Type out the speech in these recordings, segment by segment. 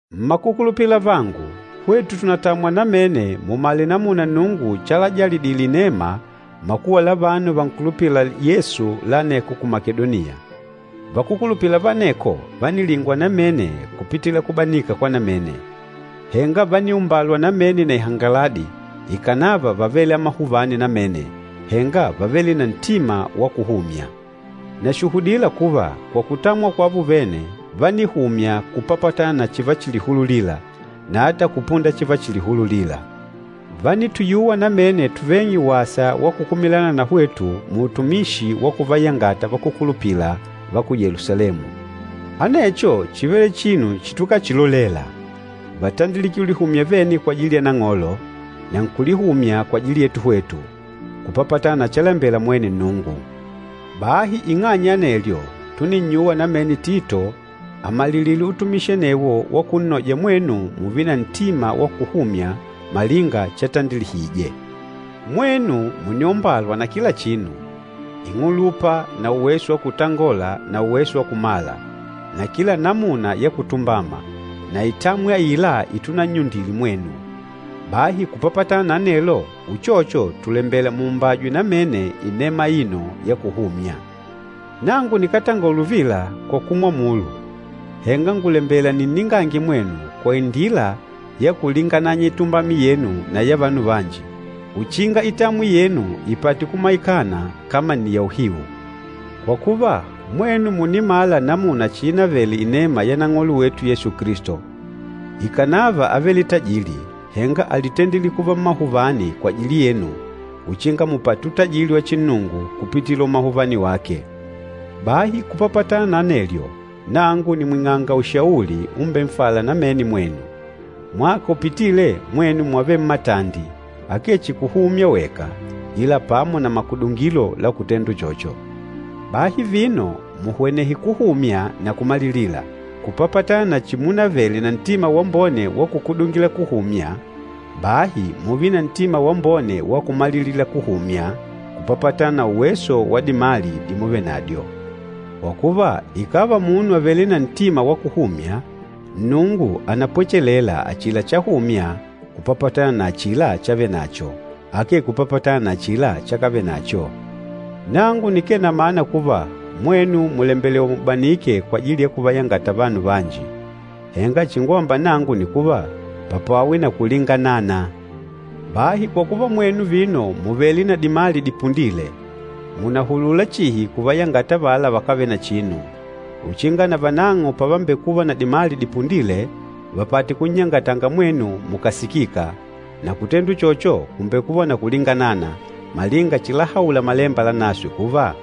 Mmakukulupila avangu, hwetu tùnatamwa namene mumale namuna Nnungu chalajalidile inema makuwa la vanu vankulupîla Yesu la aneko ku Makedoniya. Vakúkulupila va aneko vánilingwa namene kupitila kubanika kwa namene. Henga vániumbalwa namene na ihangaladi, ikànava vávele amahuvani namene, henga vávele na ntima wa kuhumya. Nàshuhudila kuva, kwa kutamwa kwavo vene, vánihumya kupapatana na chivachilihululila, na ata kupunda chivachilihululila. Vánituyuwa namene tuveng'e wasa wa kukumilana na hwetu muutumishi wa kuvayangata vakúkulupila va ku Yelusalemu. Anecho chívele chinu chitukachilolela! Vátandilike ulihumya vene kwajili ya Nang'olo, na nkulihumya kwajili yetu hwetu, kupapatana na chalembela mwene Nnungu. Bahi ing'anya ya anelyo, túninnyuwa namene Tito amalilile utumishi anewo wa kunnoja mwenu mùùve na ntima wa kuhumya malinga chatandilihije. Mwenu mùniombalwa kila chinu, ing'ulupa na uweso wa kutangola na uweso wa kumala, na kila namuna ya kutumbama, na itamwi aila itunannyundile mwenu. Bahi kupapatana na anelo, uchocho tùlembela muumbajwe namene inema aino ya kuhumya. Nangu nikátongola uvila kwa kumwamulu, henga ngùlembela ninningange mwenu kwa indila ya kulingananya itumbami yenu na ya vanu vanji, uchinga itamwi yenu ipate kumaikana kama nni ya uhiu. Kwa kuva, mwenu mùnimala namuna chiinavele inema ya Nang'olo wetu Yesu Kilisto, ikànava ávele na utajili, henga álitendile kuva mmahuvani kwajili yenu uchinga mupate utajili wa chinnungu kupitila umahuvani wake. Bahi kupapatana na anelyo, nangu nìmwing'anga ushauli umbenfâla namene mwenu. Mwaka upitîle mwenu mwávele mmatandi, akee chihi kuhumya weka, ila pamo na makudungilo la kutenda uchocho. Bahi vino, muhwenehe kuhumya na kumalilila. Kupapatana na chimunavele na ntima wambone wa kukudungila kuhumya, bahi mùùve na ntima wambone wa kumalilila kuhumya kupapatana na uweso wa dimali dimuvenadyo. Kwa kuva, ikàva munu àvele na ntima wa kuhumya, Nnungu ànapwechelela achila chahumya kupapatana na achila chavenacho, akee kupapatana na achila chakavenacho. Nangu nikee na mana kuva, mwenu mùlembelewa mubanike kwajili ya kuvayangata vanu vanji, henga chingwamba nangu nni kuva, papwawe na kulinganana. Bahi kwa kuva mwenu vino mùvele na dimali dipundîle, mùnahulula chihi kuvayangata avala vakávele na chinu, uchinga navanang'o pavambekuva na dimali dipundîle vapate kunnyangatanga mwenu mukàsikika. Na kutenda uchocho, kùmbekuva na kulinganana, malinga chilahaula Malemba Lanaswe kuva,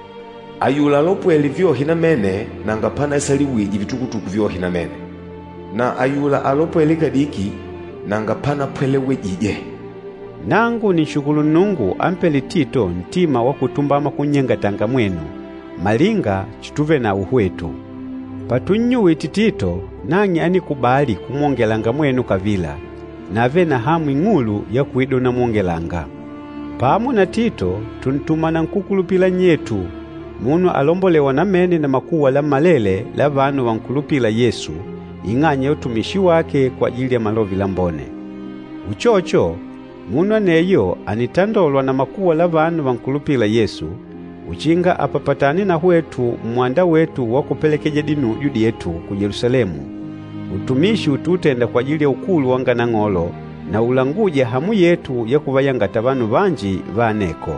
“Ayula alopwêle vyohe namene nanga panaisaliwije vitukutuku vyohe namene, na ayula alopwêle kadiki nanga panapwelewejije.” Nangu nìnshukulu Nnungu ampêle Tito ntima wa kutumbama kunnyangatanga mwenu, malinga chituvenawo hwetu. Patunnyuwite Tito, nang'e ánikubali kumwongelanga mwenu kavila, na ávele na hamu ing'ulu ya kuida unamwongelanga. Pamo na Tito, tùntuma na nkúkulupila nnyetu, munu alombolêwa namene na makuwa lammalele la vanu vankulupîla Yesu, ing'anya ya utumishi wake kwajili ya Malove Lambone. Uchocho, munu aneyo ànitandolwa na makuwa la vanu vankulupîla Yesu, uchinga apapatane na hwetu mmwanda wetu wa kupelekeja dinujo dyetu ku Yelusalemu, utumishi utuutenda kwajili ya ukulu wanga Nang'olo na ulangûja hamu yetu ya kuvayangata vanu vanji va aneko.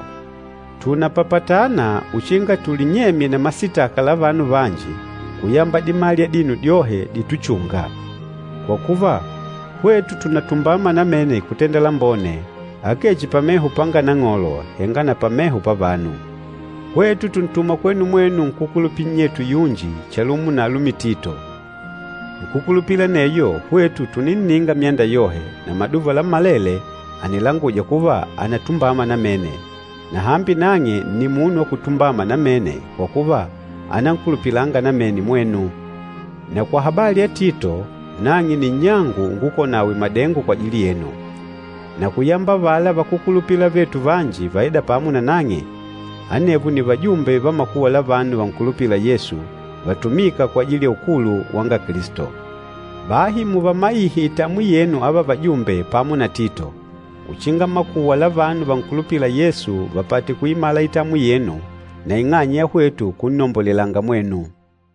Tùnapapatana uchinga tulinyemye na masitaka la vanu vanji kuyamba dimali adino dyohe dítuchùngà. Kwa kuva, hwetu tùnatumbama namene kutenda lambone, akee chihi pameho panga Nang'olo, henga na pameho pavanu. Hwetu tùntuma kwenu mwenu nkúkulupila nnyetu yunji chalumo na alumi Tito. Nkúkulupila aneyo, hwetu tùninninga myanda yohe, na maduva lammalele ànilanguja kuva ànatumbama namene. Na hambi nang'e nni munu wa kutumbama namene kwa kuva ànankulupilanga namene mwenu. Na kwa habali ya Tito, nang'e nni nnyangu ungukola nawe madengo kwajili yenu. Na kuyamba avala vakúkulupila avetu vanji vaîda pamo nanang'e, anevo nni vajumbe va makuwa la vanu vankulupîla Yesu, vatumîka kwajili ya ukulu wanga Kilisto. Bahi muvamaihe itamwi yenu ava vajumbe pamo na Tito, uchinga makuwa la vanu vankulupîla Yesu vapate kuimala itamwi yenu, na ing'anya ya hwetu kunnombolelanga mwenu.